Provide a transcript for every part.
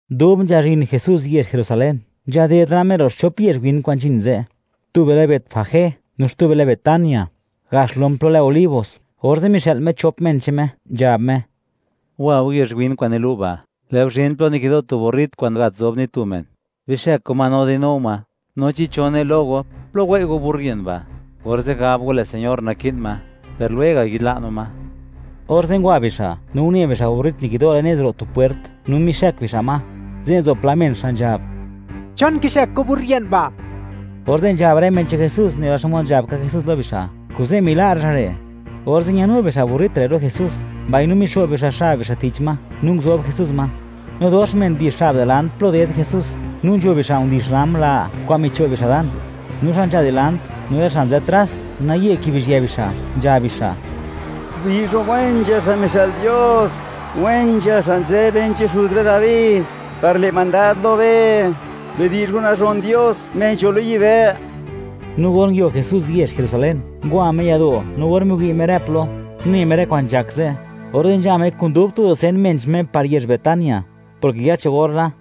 Dub nzhazhin Jesús yezh Jerusalén, nzhaded la Me ro' xchop yezh win kwa'n nzhin ze'; tube lë Betfagé, no xtube lë Betania, gax lom plo lë Olivos; orze' mixë'l Me chop men che'n Me, nzhab Me: ―Wa go yezh win kwa'n nilu' ba', lë' go zhin plo nikido' tu burrit kwa'n gat zob ni tu men; bixëk go ma no di'nu go ma, no chi cho ne lo go: “¿Plo wei' go burrit ba'?”, orze' gab go: “Lë' Señor naki'n ma, per lwega' yi'dla' no ma.” Orze' ngwa bixa', no une bixa' burrit nikido' le'n nez ro' tu pwert, no mixëk bixa' ma. Ze' nzo pla men, xa' nzhab: ―¿Chon kixëk go burrit ba'? Orze' nzhab rë men che'n Jesús nela xmod nzhab ka Jesús lo bixa', kuze' mila' rë xa' re'. Orze' ñano bixa' burrit re' lo Jesús, mbaino mixo'b bixa' xab bixa' tich ma no nguzob Jesús ma. No dox men ndix xab dilant plo ded Jesús, no nzho bixa' ndix rram la kwa'n micho' bixa' dan, no xa' nzha dilant, no rë xa' nzë tras, naye kibizhië bixa', nzhab bixa': ¡Bidi'zh go wen nzha xa' mixë'l Dios! ¡Wen nzha xa' nzë ben che'n xuz be Dabi par le' mandad lo be! ¡Bidi'zh go nazhon Dios, Me nzho lo yibë'! No or nguio Jesús yezh Jerusalén, ngwa Me yado'; no or miwi' Me rë plo, une Me rë kwa'n nzhak ze', orze' nzha Me kun dub tu dusen men che'n Me par yezh Betania, porke ya cho gor la.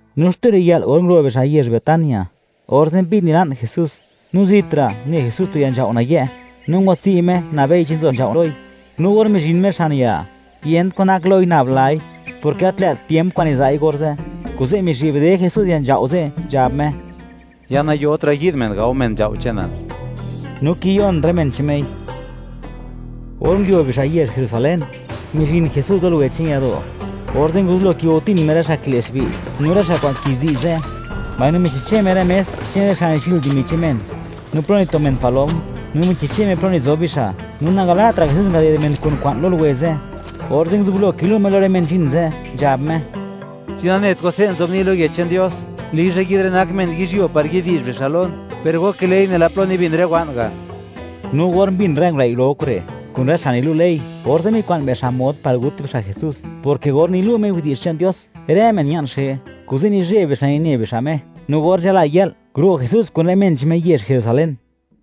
No xtu riyë'l, or nguro' bixa' yezh Betania, orze' mbi'd nila'n Jesús, no zitra', une Jesús tu ya nzhao' nayë', no ngwatswi' Me, nabei chi nzo nzhao' loi; no or mizhin Me xan ya, yent kwan nak loi, nab lai, porke gat lë't tiemp kwa'n niza'i orze'. Kuze' mizhi'bde Jesús ya nzhao' ze', nzhab Me: ―Ya nayotra' yi'd men, gao men nzhao' che'nal. No kiyon rë men che'n Mei. Or nguio bixa' yezh Jerusalén, mizhin Jesús lo luwe che'n yado'; orze' nguzublo kigo'tin Me rë xa' kile'xbi' no rë xa' kwa'n kizi' ze', mbaino michixche Me rë mes che'n rë xa' nichi'l dimi che'n men, no plo nito men palom, no michixche Me plo nizob bixa'. No nangala'tra' Jesús ngaded men kun kwa'n lo luwe ze'. Orze' nguzublo kilu' Me lo rë men nzhin ze', nzhab Me: ―¿Chi nanet go, se' nzobni' lo Yech che'n Dios: “Lizha yi'd rë nak men yizhyuo, par yi'di'zh bixa' lon”? ¡Per go kile'i nela plo nibin rë wa'n ga'! No or mbin rë ngulëi' ro kure', kun rë xa' nilu' ley, orze' mikwa'n bixa' mod par gut bixa' Jesús, porke or nilu' Me widi'zh che'n Dios, rë men ña'n xe. Kuze' nizheb bixa' nine bixa' Me. No or nzhala yë'l, nguro' Jesús kun rë men che'n Me, yezh Jerusalén.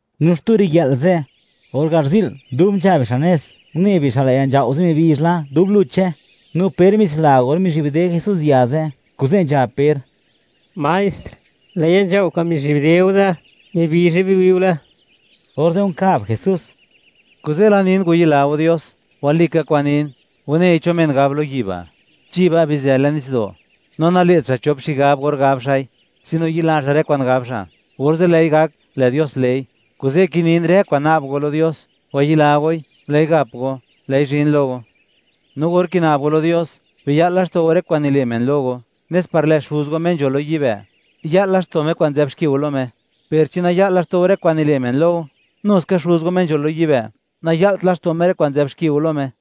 No xtu riyë'l ze', or garzi'l; dub nzha bixa' nez, une bixa', lë' ya nzhao' ze' mibizh la, dub luche. No Per mitsila or mizhi'bde Jesús ya ze', kuze' nzhab Per: ―Maestr, lë' ya nzhao' kwa'n mizhi'bde go ze', ¡mibizhe biwi'ule! Orze' nkab Jesús: ―Kuze' la nin, wayila go Dios. Walika kwa'n nin, wanei cho men gab lo yi' ba': “Chi ba', bizë le'n nitsdo'”, no nale't xa' chop xigab or gab xa'i, sino yila xa' rë kwa'n gab xa', orze' lë'i gak, lë' Dios le'i. Kuze' kinin, rë kwa'n na'b go lo Dios, wayila goi, lë'i gap go; lë'i zhin lo go. No or kina'b go lo Dios, biya'l laxto' go rë kwa'n nile' men lo go, nes par lë' Xuz go, Me nzho lo yibë', ya'l laxto' Me rë kwa'n nzë'b xki go lo Me. Per chi naya'l laxto' go rë kwa'n nile' men lo go, nu ska Xuz go, Me nzho lo yibë', naya'lt laxto' Me rë kwa'n nzë'b xki go lo Me.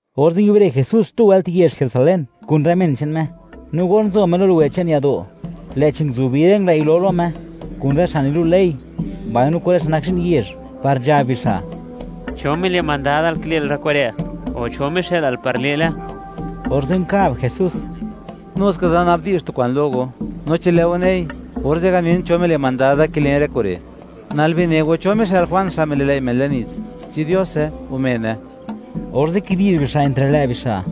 Orze' nguiubre Jesús xtu wëlt yezh Jerusalén kun rë men che'n Me. No or nzo Me lo luwe che'n yado', lë'chi nguzubi rë ngulëi' ro lo Me, kun rë xa' nilu' ley, mbaino kun rë xa' nak zhi'n yezh, par nzhab bixa': ―¿Cho mile' mandadal kile'l rë kure', o cho mixë'lal par le'le? Orze' nkab Jesús: ―Nuska da nabdi'zh tu kwa'n lo go; no chi lë' go nei, orze' ganin cho mile' mandad da kilen rë kure'. Nal bine go, ¿cho mixë'l Juan, xa' mili'lëi' men le'n nits? ¿Chi Diose, o mene? Orze' kidi'zh bixa' entre lë' bixa':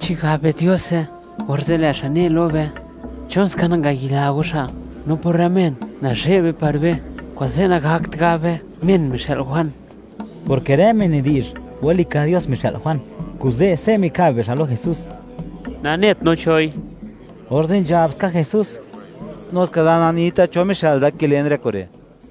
―Chi gab be: “Diose”, orze' lë' xa' ne lo be: “¿Chon ska nangayila go xa'?” No por rë men, nazhe'b be par be, kuze' nagakt gab be: “Men mixë'l Juan”. Porke rë men nidi'zh, walika Dios mixë'l Juan, kuze', se' mikab bixa' lo Jesús: ―Nanet no choi. Orze' nzhab ska Jesús: ―Nuska da nanita, cho mixë'l da, kilen rë kure'.